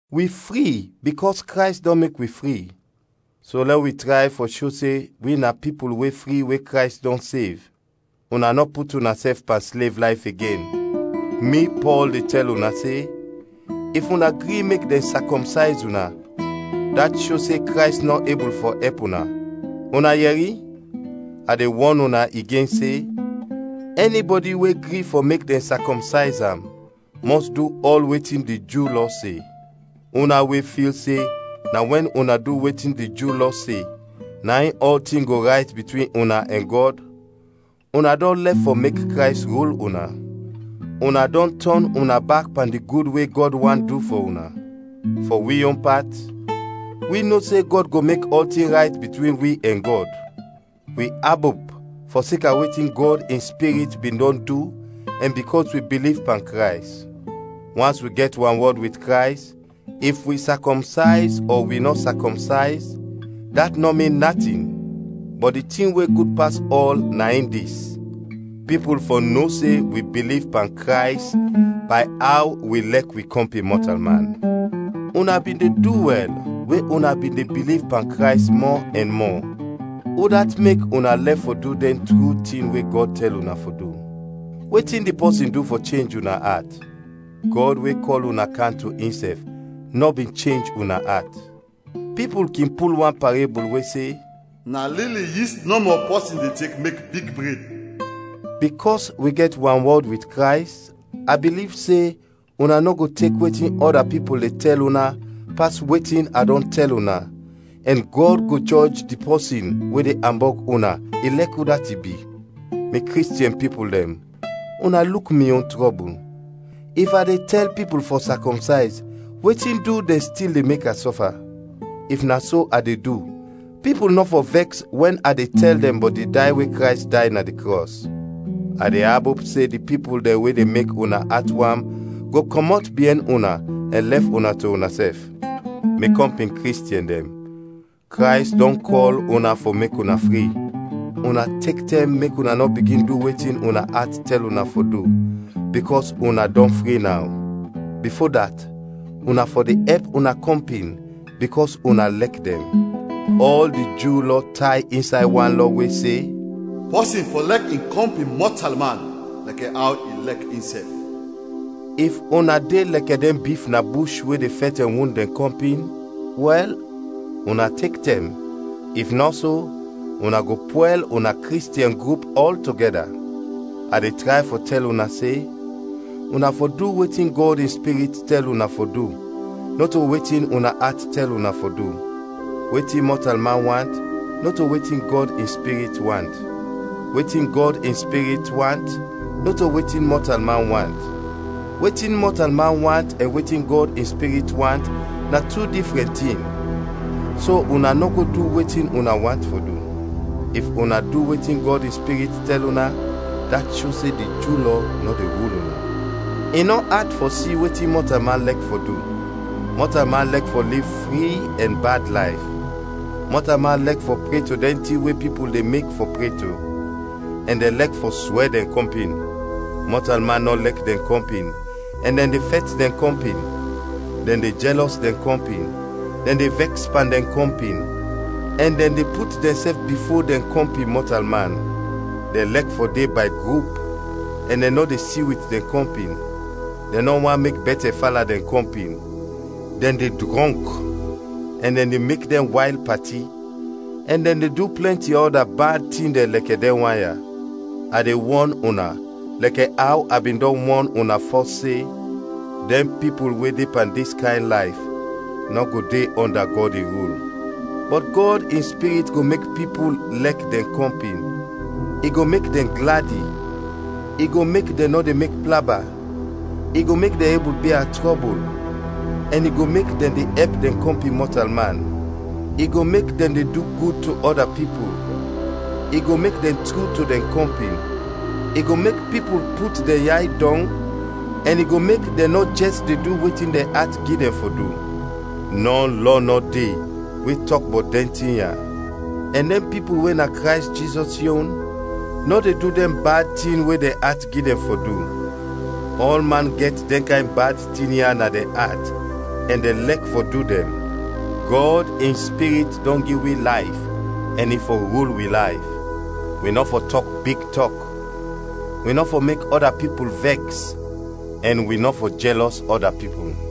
Wi fri bikɔs Krays dɔn mek wi fri; so lɛ wi tray fɔ sho se wi na pipul we fri we Krays dɔn sev. Una nɔ put unasɛf pan slev layf igen. Mi, Pɔl, de tɛl una se, if una gri mek dɛn sakɔmsayz una, dat sho se Krays nɔ ebul fɔ ɛp una. Una yɛri? A de wɔn una igen se, ɛnibɔdi we gri fɔ mek dɛn sakɔmsayz am, mɔs du ɔl wetin di Ju Lɔ se. Una we fil se na wɛn una du wetin di Ju Lɔ se, na in ɔltin go rayt bitwin una ɛn Gɔd, una dɔn lɛf fɔ mek Krays rul una. Una dɔn tɔn una bak pan di gud we Gɔd want du fɔ una. Fɔ wi yon pat, wi no se Gɔd go mek ɔltin rayt bitwin wi ɛn Gɔd. Wi abop fɔseka wetin Gɔd in Spirit bin dɔn du ɛn bikɔs wi biliv pan Krays. Wans wi gɛt wanwɔd wit Krays, if wi sakɔmsayz ɔ wi nɔ sakɔmsayz, dat nɔ min natin. Bɔt di tin we gud pas ɔl na in dis: pipul fɔ no se wi biliv pan Krays bay aw wi lɛk wi kɔmpin mɔtalman. Una bin de du wɛl we una bin de biliv pan Krays mɔ ɛn mɔ; udat mek una lɛf fɔ du dɛn tru tin we Gɔd tɛl una fɔ du? Wetin di pɔsin du fɔ chenj una at? Gɔd we kɔl una kam to insɛf nɔ bin chenj una at. Pipul kin pul wan parebul we se, “Na lili yist nɔmɔ pɔsin de tek mek big bred.” Bikɔs wi gɛt wanwɔd wit Krays, a biliv se una nɔ go tek wetin ɔda pipul de tɛl una, pas wetin a dɔn tɛl una, ɛn Gɔd go jɔj di pɔsin we de ambɔg una, ilɛk udat i bi. Mi Kristiɛn pipul dɛn, una luk mi yon trɔbul, if a de tɛl pipul fɔ sakɔmsayz, wetin du dɛn stil de mek a sɔfa? If na so a de du, pipul nɔ fɔ vɛks wɛn a tɛl dɛn bɔt di day we Krays day na di krɔs. A de abop se di pipul dɛn we de mek una at wam go kɔmɔt biɛn una, ɛn lɛf una to unasɛf. Mi kɔmpin Kristiɛn dɛn, Krays dɔn kɔl una fɔ mek una fri. Una tek tɛm mek una nɔ bigin du wetin una at tɛl una fɔ du, bikɔs una dɔn fri naw. Bifo dat, una fɔ de ɛp una kɔmpin bikɔs una lɛk dɛn. Ɔl di Ju Lɔ tay insay wan lɔ we se: “Pɔsin fɔ lɛk in kɔmpin mɔtalman lɛkɛ aw i lɛk insɛf.” If una de lɛkɛ dɛn bif na bush we de fɛt ɛn wund dɛn kɔmpin, wɛl, una tek tɛm, if nɔ so, una go pwɛl una Kristiɛn grup ɔltogɛda. A de tray fɔ tɛl una se: una fɔ du wetin Gɔd in Spirit tɛl una fɔ du, nɔto wetin una at tɛl una fɔ du. Wetin mɔtalman want, nɔto wetin Gɔd in Spirit want. Wetin Gɔd in Spirit want, nɔto wetin mɔtalman want. Wetin mɔtalman want ɛn wetin Gɔd in Spirit want na tu difrɛn tin, so una nɔ go du wetin una want fɔ du. If una du wetin Gɔd in Spirit tɛl una, dat sho se di Ju Lɔ nɔ de rul una. I nɔ at fɔ si wetin mɔtalman lɛk fɔ du: mɔtalman lɛk fɔ liv fri ɛn bad layf, mɔtalman lɛk fɔ pre to dɛn tin we pipul de mek fɔ pre to, ɛn dɛn lɛk fɔ swɛ dɛn kɔmpin. Mɔtalman nɔ lɛk dɛn kɔmpin, ɛn dɛn de fɛt dɛn kɔmpin; dɛn de jɛlɔs dɛn kɔmpin, dɛn de vɛks pan dɛn kɔmpin, ɛn dɛn de put dɛnsɛf bifo dɛn kɔmpin mɔtalman. Dɛn lɛk fɔ de bay grup ɛn dɛn nɔ de si wit dɛn kɔmpin; dɛn nɔ want mek bɛtɛ fala dɛn kɔmpin, dɛn de drɔnk, ɛn dɛn de mek dɛn wayl pati, ɛn dɛn de du plɛnti ɔda bad tin dɛn lɛkɛ dɛn wan ya. A de wɔn una lɛkɛ aw a bin dɔn wɔn una fɔs se: dɛn pipul we de pan dis kayn layf nɔ go de ɔnda Gɔd in rul. Bɔt Gɔd in Spirit go mek pipul lɛk dɛn kɔmpin, i go mek dɛn gladi, i go mek dɛn nɔ de mek plaba, i go mek dɛn ebul bia trɔbul, ɛn i go mek dɛn de ɛp dɛn kɔmpin mɔtalman, i go mek dɛn de du gud to ɔda pipul, i go mek dɛn tru to dɛn kɔmpin, i go mek pipul put dɛn yay dɔng ɛn i go mek dɛn nɔ jɛs de du wetin dɛn at gi dɛn fɔ du. Nɔ lɔ nɔ de we tɔk bɔt dɛn tin ya. Ɛn dɛn pipul we na Krays Jizɔs yon nɔ de du dɛn bad tin we dɛn at gi dɛn fɔ du. Ɔlman gɛt dɛn kayn bad tin dɛn ya na dɛn at ɛn dɛn lɛk fɔ du dɛn. Gɔd in Spirit dɔn gi wi layf ɛn i fɔ rul wi layf. Wi nɔ fɔ tɔk big tɔk, wi nɔ fɔ mek ɔda pipul vɛks ɛn wi nɔ fɔ jɛlɔs ɔda pipul.